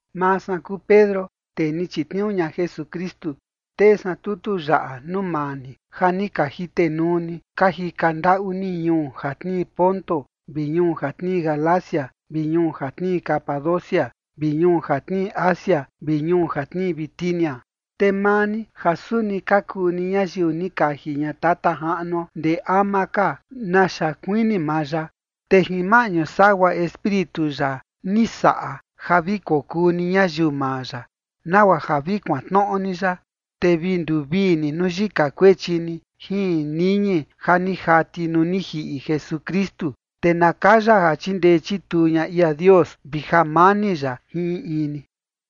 Maa san kuu Pedro, tee ni chitniuu ña Jesukristu, tee san tutu yaꞌa nuu maa ni ja ni ka jitenuu ni ka jika ndaꞌu ni ñuu ja tnii Ponto vi ñuu ja tnii Galacia vi ñuu ja tnii Capadocia vi ñuu ja tnii Asia vi ñuu ja tnii Bitinia. Te maa ni ja suni ka kuu ni ñayiu ni kaji ña Tata Jaꞌnuo ndee ama ka naxa kuini maa ya, te jin maꞌñu sagua Espíritu ya ni saꞌa ja vi kokuu ni ñayiu maa ya, nagua ja vi kuantnoꞌo ni ya, te vi nduvii ni nuu yika kuechi ni jin niñi ja ni jati nuu ni jiꞌi Jesukristu. Te na kaya ja chindee chituu ña ia Dios vi jamani ya jin in in ni.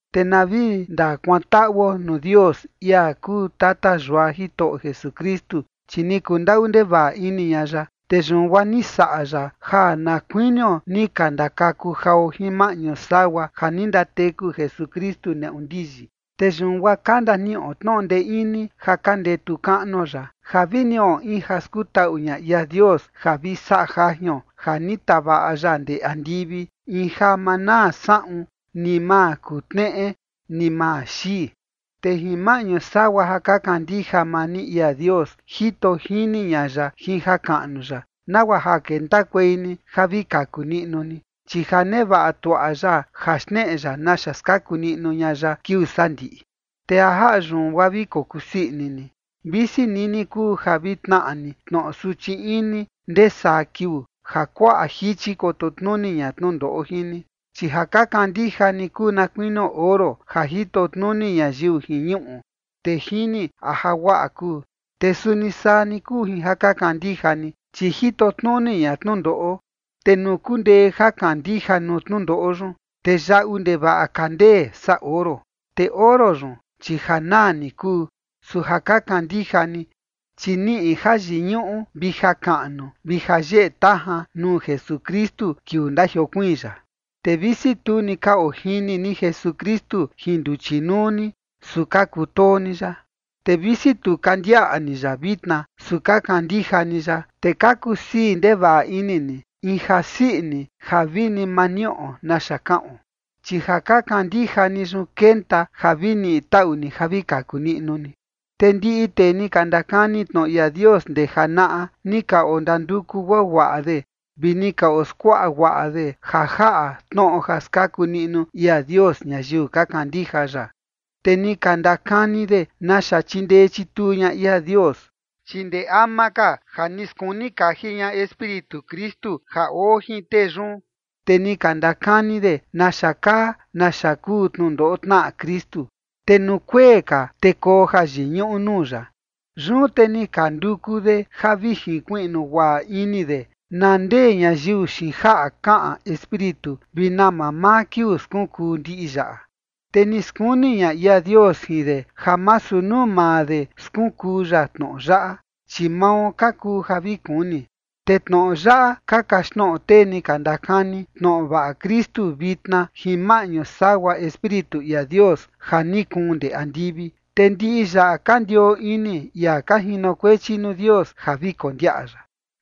Te na vi ndakuantaꞌuo nuu Dios, ia kuu tata yua Jitoꞌo Jesukristu, chi ni kundaꞌu ndevaꞌa ini ña ya, te yun guaa ni saꞌa ya ja na kuinio ni ka ndakaku jao jin maꞌñu sagua ja ni ndateku Jesukristu neꞌu ndiyi. Te yun guaa ka ndaniꞌo tnoꞌo ndee ini ja ka ndetu kaꞌnuo ya, ja vi niꞌo in ja skutaꞌu ña ia Dios ja vi saꞌa jajion ja ni tavaꞌa ya ndee andivi, in ja ma naa saꞌun, ni ma kutneꞌe, ni ma xii. Te jin maꞌñu sagua ja ka kandija maa ni ia Dios, jito jini ña ya jin jakaꞌnu ya, nagua ja kentakuei ni ja vi kaku niꞌnu ni, chi ja nevaꞌa tuaꞌa ya ja xneꞌe ya naxa skaku niꞌnu ña ya kiuu sandiꞌi. Te ja jaꞌa yun, guaa vi kokusii ini ni, visi nini kuu ja vi tnaꞌa ni tnoꞌo suchi ini ndee saa kiuu ja kuaꞌa jichi koto tnuni ña tnundoꞌo jin ni. Chi ja ka kandija ni kuu na kuinio oro ja jito tnuni ñayiu jin ñuꞌu, te jini a ja guaꞌa kuu. Te suni saa ni kuu jin ja ka kandija ni, chi jito tnuni ña tnundoꞌo. Te nuu kundee jakandija nuu tnundoꞌo yun, te yaꞌu ndevaꞌa ka ndee saa oro. Te oro yun, chi ja naa ni kuu, su ja ka kandija ni, chi niꞌi jayiñuꞌu vi jakaꞌnu vi jayeꞌe tajan nuu Jesukristu kiuu ndajiokuiin ya. Te visi tu ni ka ojini ni Jesukristu jin nduchi nuu ni, su ka kutoo ni ya. Te visi tu ka ndiaꞌa ni ya vitna, su ka kandija ni ya. Te ka kusii ndevaꞌa ini ni in jasii ini ja vini ma niꞌo naxa kaꞌon. Chi ja ka kandija ni yun, kenta ja vi niꞌi taꞌu ni ja vi kaku niꞌnu ni. Te ndiꞌi tee ni ka ndakani tnoꞌo ia Dios ndee janaꞌa ni ka ondanduku guaguaꞌa de vi ni ka oskuaꞌa guaꞌa de ja jaꞌa tnoꞌo ja skaku niꞌnu ia Dios ñayiu ka kandija ya. Te ni ka ndakani de naxa chindee chituu ña ia Dios. Chi ndee ama ka ja ni skuni kaji ña Espíritu Kristu ja oo jin tee yun, te ni ka ndakani de naxa kaa naxa kuu tnundoꞌo tnaꞌa Kristu, te nuu kuee ka, te koo jayiñuꞌu nuu ya. Yun te ni ka nduku de ja vi jinkuiꞌnu guaꞌa ini de na ndee ñayiu xiin jaꞌa kaꞌan Espíritu vi na mamaa kiuu skunkuu ndiꞌi yaꞌa. Te ni skuni ña ia Dios jin de ja masu nuu maa de skunkuu ya tnoꞌo yaꞌa, chi mao ka kuu ja vi kuni. Te tnoꞌo yaꞌa ka kaxtnoꞌo tee ni ka ndakani tnoꞌo vaꞌa Kristu vitna jin maꞌñu sagua Espíritu ia Dios ja ni kuun ndee andivi. Te ndiꞌi yaꞌa ka ndioo ini ia ka jinokuechi nuu Dios ja vi kondiaꞌa ya.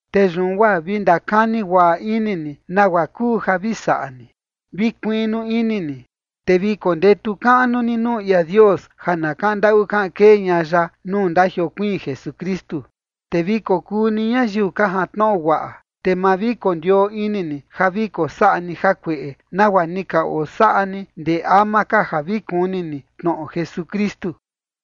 Te yun guaa vi ndakani guaꞌa ini ni nagua kuu ja vi saꞌa ni. Vi kuiꞌnu ini ni, te vi kondetu kaꞌnu ni nuu ia Dios ja na kaꞌan ndaꞌu kaꞌan kee ña ya nuu ndajiokuiin Jesukristu. Te vi kokuu ni ñayiu ka jantnoꞌo guaꞌa, te ma vi kondioo ini ni ja vi kosaꞌa ni jakueꞌe, nagua ni ka osaꞌa ni ndee ama ka ja vi kuni ni tnoꞌo Jesukristu.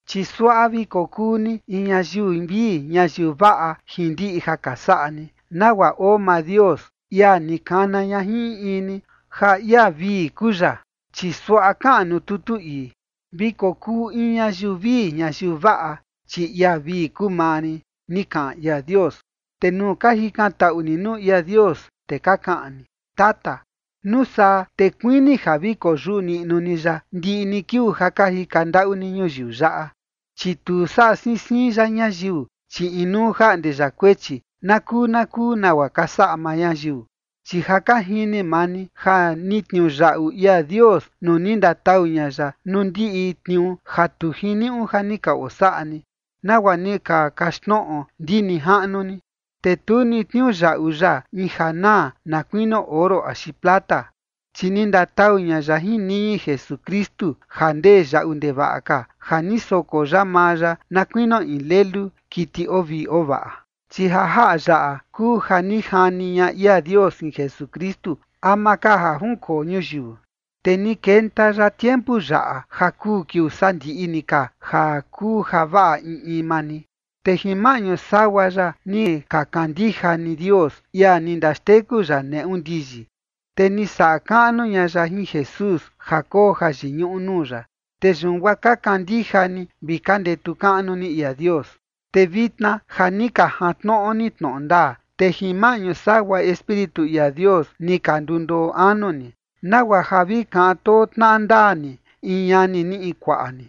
Chi suaꞌa vi kokuu ni in ñayiu vii ñayiu vaꞌa jin ndiꞌi ja ka saꞌa ni, nagua oo maa Dios, ia ni kana ña jin in in ni ja ia vii kuu ya. Chi suaꞌa kaꞌan nuu tutu ii: “Vi kokuu in ñayiu vii ñayiu vaꞌa, chi ia vii kuu maa rin” ni kaꞌan ia Dios. Te nuu ka jikantaꞌu ni nuu ia Dios, te ka kaꞌan ni “Tata”, nuu saa te kuini ja vi koyuꞌu niꞌnu ni ya ndiꞌi ni kiuu ja ka jika ndaꞌu ni ñuyiu yaꞌa, chi tu saꞌa siin siin ya ñayiu, chi inuu jaꞌnde ya kuechi na kuu na kuu nagua ka saꞌa maa ñayiu. Chi ja ka jini maa ni ja ni tniuyaꞌu ia Dios nuu ni ndatau ña ya nuu ndiꞌi tniuu ja tu jiniuꞌu ja ni ka osaꞌa ni, nagua ni ka kaxtnoꞌo ndi nijaꞌnu ni. Te tu ni tniuyaꞌu ya in ja naa, na kuinio oro axi plata, chi ni ndatau ña ya jin niñi Jesukristu ja ndee yaꞌu ndevaꞌa ka, ja ni soko ya maa ya na kuinio in lelu, kiti oo vii oo vaꞌa. Chi ja jaꞌa yaꞌa kuu ja ni jani ña ia Dios jin Jesukristu ama ka ja junkoo ñuyiu, te ni kenta ya tiempu yaꞌa ja kuu kiuu sandiꞌi ni ka ja kuu javaꞌa in in maa ni. Te jin maꞌñu sagua ya ni ka kandija ni Dios, ia ni ndaxteku ya neꞌu ndiyi. Te ni saꞌa kaꞌnu ña ya jin Jesús ja koo jayiñuꞌu nuu ya. Te yun guaa ka kandija ni vi ka ndetu kaꞌnu ni ia Dios. Te vitna ja ni ka jantnoꞌo ni tnoꞌo ndaa, te jin maꞌñu sagua Espíritu ia Dios ni ka ndundoo anu ni, nagua ja vi kaꞌan too tnaꞌa ndaa ni in ñani ni, in kuaꞌa ni.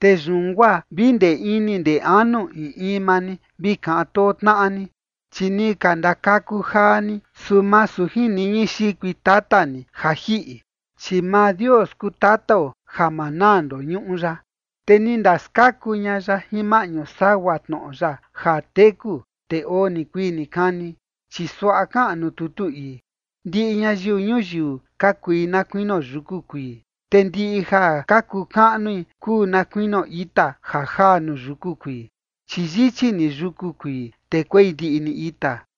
Te yun guaa vi ndee ini ndee anu in in maa ni vi kaꞌan too tnaꞌa ni. Chi ni ka ndakaku jaa ni, su masu jin niñi xikui tata ni ja jiꞌi, chi maa Dios kuu tatao ja ma naa ndoñuꞌu ya, te ni ndaskaku ña ya jin maꞌñu sagua tnoꞌo ya ja teku, te oo nikuii nikani. Chi suaꞌa kaꞌan nuu tutu ii: Ndiꞌi ñayiu ñuyiu ka kui na kuinio yuku kuii, te ndiꞌi ja ka kuu kaꞌnui kuu na kuinio ita ja jaa nuu yuku kuii. Chi yichi ni yuku kuii, te kuei ndiꞌi ni ita,